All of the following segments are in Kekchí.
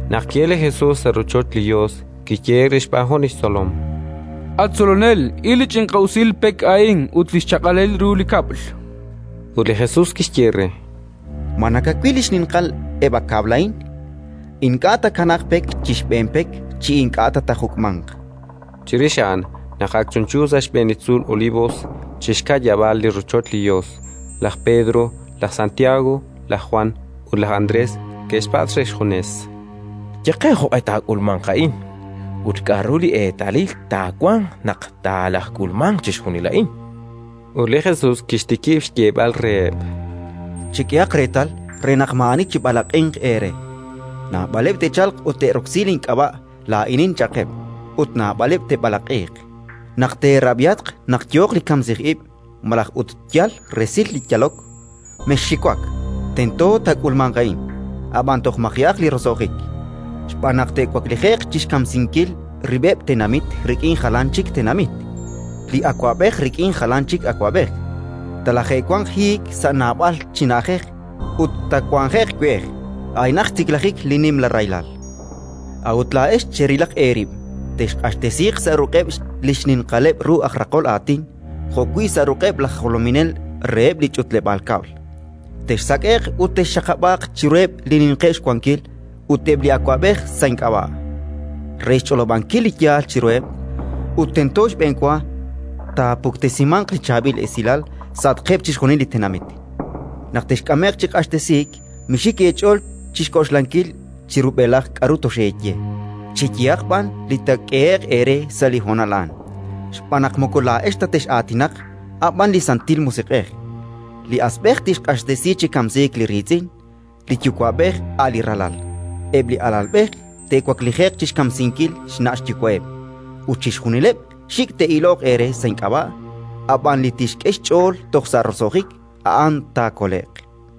Naq ki'elk li Jesus sa' rochoch li Yos, kiyehe'k re xb'aan jun li xtzolom: —At Tzolonel, il a ch'inqi'usil pek a'in ut li xchaq'alil ru li kab'l! Ut li Jesus kixye re: —Ma nakawil xninqal eb' a kab'l a'in? Ink'a' taakanaaq pek chi xb'een pek chi ink'a' ta taajuk'manq. Chirix a'an, naq ak chunchu sa' xb'een li tzuul Olivos, chi xka'yab'aal li rochoch li Yos, laj Pedro, laj Santiago, laj Jwan ut laj Andrés ke'xpatz' re xjunes: —Ye qe jo'q'e taak'ulmanq a'in ut k'aru li eetalil taawanq naq talajk'ulmanq chixjunil a'in. Ut li Jesus kixtikib' xyeeb'al reheb': “Chek'ehaq reetal re naq maa'ani chib'alaq'inq eere. Naab'aleb' te'chalq ut te'roksi link'ab'a': «Laa'inin», cha'qeb'; ut naab'aleb' te'b'alaq'iiq. “Naq teerab'ihatq naq yooq li kamsij ib' malaj ut yal resil li yalok, mexxiwak: tento taak'ulmanq a'in; ab'an toj maji'aq li roso'jik. Xb'aan naq te'waklije'q chi xkamsinkil rib'eb' tenamit rik'in jalan chik tenamit, li awab'ej rik'in jalan chik awab'ej; talaje'wanq hiik sa' naab'al chi na'ajej ut taawanje'q we'ej: a'inaq xtiklajik li nimla rahilal. “A'ut laa'ex cherilaq eerib'. Texq'axtesiiq sa' ruq'eb' li xninqaleb' ru aj raqol aatin jo'wi' sa' ruq'eb' laj jolominel reheb' li ch'utleb'aal kab'l; texsak'e'q ut texxaqab'aaq chiruheb' li ninqeb' xwankil ut eb' li awab'ej sa' ink'ab'a', re xch'olob'ankil li yaal chiruheb'. Ut tento xb'enwa taapuktesimanq li Chaab'il Esilal sa'atqeb' chixjunil li tenamit. Naq texk'ame'q chi q'axtesiik, mixik eech'ool chi xk'oxlankil chi rub'elaj k'aru toxeeye, cheyehaq b'an li taak'ehe'q eere sa' li honal a'an: xb'aan naq moko laa'ex ta tex'aatinaq, a' b'an li Santil Musiq'ej. Li asb'ej tixq'axtesi chi kamsiik li riitz'in; li yuwa'b'ej a' li ralal; eb' li alalb'ej te'waklije'q chi xkamsinkil xna' xyuwa'eb'. Ut chixjunileb' xik' te'iloq eere sa' ink'ab'a'; ab'an li tixk'e xch'ool toj sa' roso'jik, a'an taakole'q.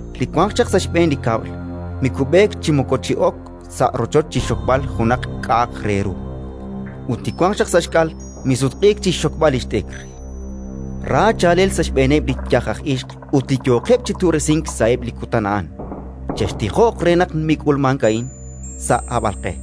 Li wanq chaq sa' xb'een li kab'l mikub'eek chi moko chi'ok sa' rochoch chi xxokb'al junaq k'a'aq re ru; ut li wanq chaq sa' xk'al misutq'iik chi xxokb'al li xt'ikr. Ra chaalel sa' xb'eeneb' li yaj aj ixq ut li yooqeb' chi tu'resink sa'eb' li kutan a'an. Chextijoq re naq mik'ulmank a'in sa' hab'alq'e.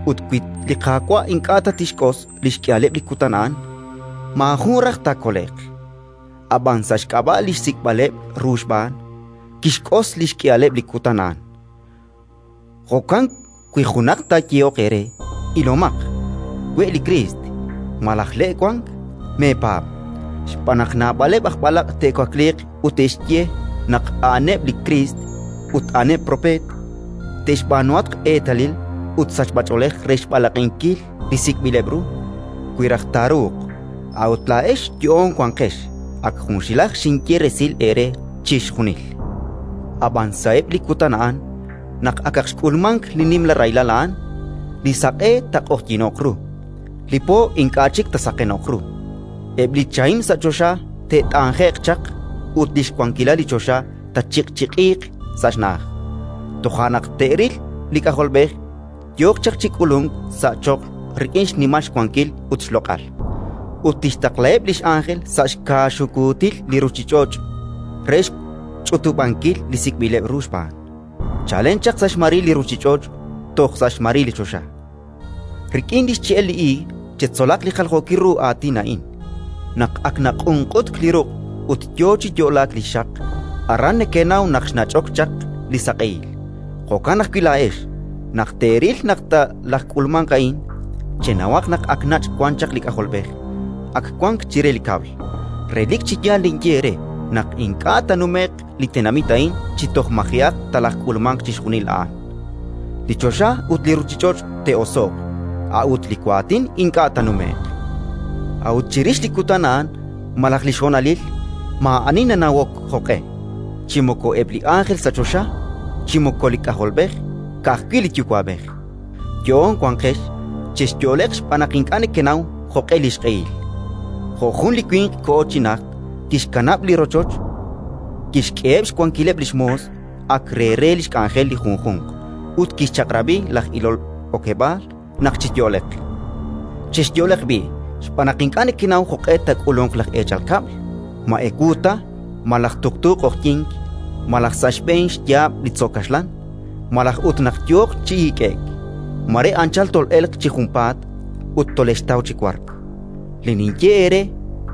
Ut wi li Qaawa' ink'a' ta tixk'os li xk'ihaleb' li kutan a'an, maajun raj taakole'q; ab'an, sa' xk'ab'a' li sik'b'ileb' ru xb'aan, kixk'os li xk'ihaleb' li kutan a'an. “Jo'kan wi junaq taayehoq eere: «Ilomaq, we' li Kriist» malaj: «Le' wank», meepaab'. Xb'aan naq naab'aleb' aj b'alaq' te'wakliiq ut te'xye naq a'aneb' li Kriist ut a'aneb' propeet; te'xb'aanuhatq eetalil ut sachb'ach'oolej re xb'alaq'inkil li sik'b'ileb' ru, wi raj taaruuq. A'ut laa'ex yo'oon wanqex; ak junxilaj xinye resil eere chixjunil. “Ab'an sa'eb' li kutan a'an, naq akaq xk'ulmank li nimla rahilal a'an, li saq'e taaq'oqyino'q ru, li po ink'a' chik taasaqeno'q ru; eb' li chahim sa' choxa te't'anje'q chaq ut li xwankilal li choxa taachiq'chiq'iiq sa' xna'aj. Toja' naq te'ril li K'ajolb'ej yooq chaq chi k'ulunk sa' choql rik'in xnimal xwankil ut xloq'al. Ut tixtaqlaheb' li x'ánjel sa' xkaaxukuutil li ruuchich'och' re xch'utub'ankil li sik'b'ileb' ru xb'aan, chalen chaq sa' xmaril li ruuchich'och' toj sa' xmaril li choxa. “Rik'in li xche'el li iig chetzolaq li jaljookil ru aatin a'in. Naq ak naq'unq'utk li ruq' ut yo chi yo'laak li xxaq, aran nekenaw naq xnach'ok chaq li saq'ehil. Jo'kan ajwi' laa'ex, naq teeril naq talajk'ulmanq a'in, chenawaq naq ak nach' wan chaq li K'ajolb'ej; ak wank chire li kab'l. Relik chi yaal ninye eere naq ink'a' taanume'q li tenamit a'in chi toj maji'aq talajk'ulmanq chixjunil a'an. Li choxa ut li ruuchich'och' te'oso'q, a'ut li waatin ink'a' taanume'q. “A'ut chirix li kutan a'an malaj li xhonalil, maa'ani nanawok jo'q'e, chi moko eb' li ánjel sa' choxa, chi moko li K'ajolb'ej, ka'ajwi' li Yuwa'b'ej. “Yo'oon wanqex, chexyo'leq xb'aan naq ink'a' nekenaw jo'q'e li xq'ehil. Jo' jun li winq koho chi najt: kixkanab' li rochoch, kixk'eheb' xwankileb' li xmoos, ak re re li xk'anjel li junjunq, ut kixchaq'rab'i laj ilol okeb'aal naq chiyo'leq. Chexyo'leq b'i', xb'aan naq ink'a' nekenaw jo'q'e taak'ulunq laj eechal kab'l, ma ewu ta, malaj tuqtuuq q'oqyink, malaj sa' xb'een xyaab' li tzo' kaxlan, malaj ut naq yooq chi hik'e'k. Mare anchal tol'elq chi junpaat ut tolexxtaw chi wark. Li ninye eere,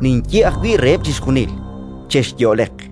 ninye ajwi' reheb' chixjunil: Chexyo'leq!”.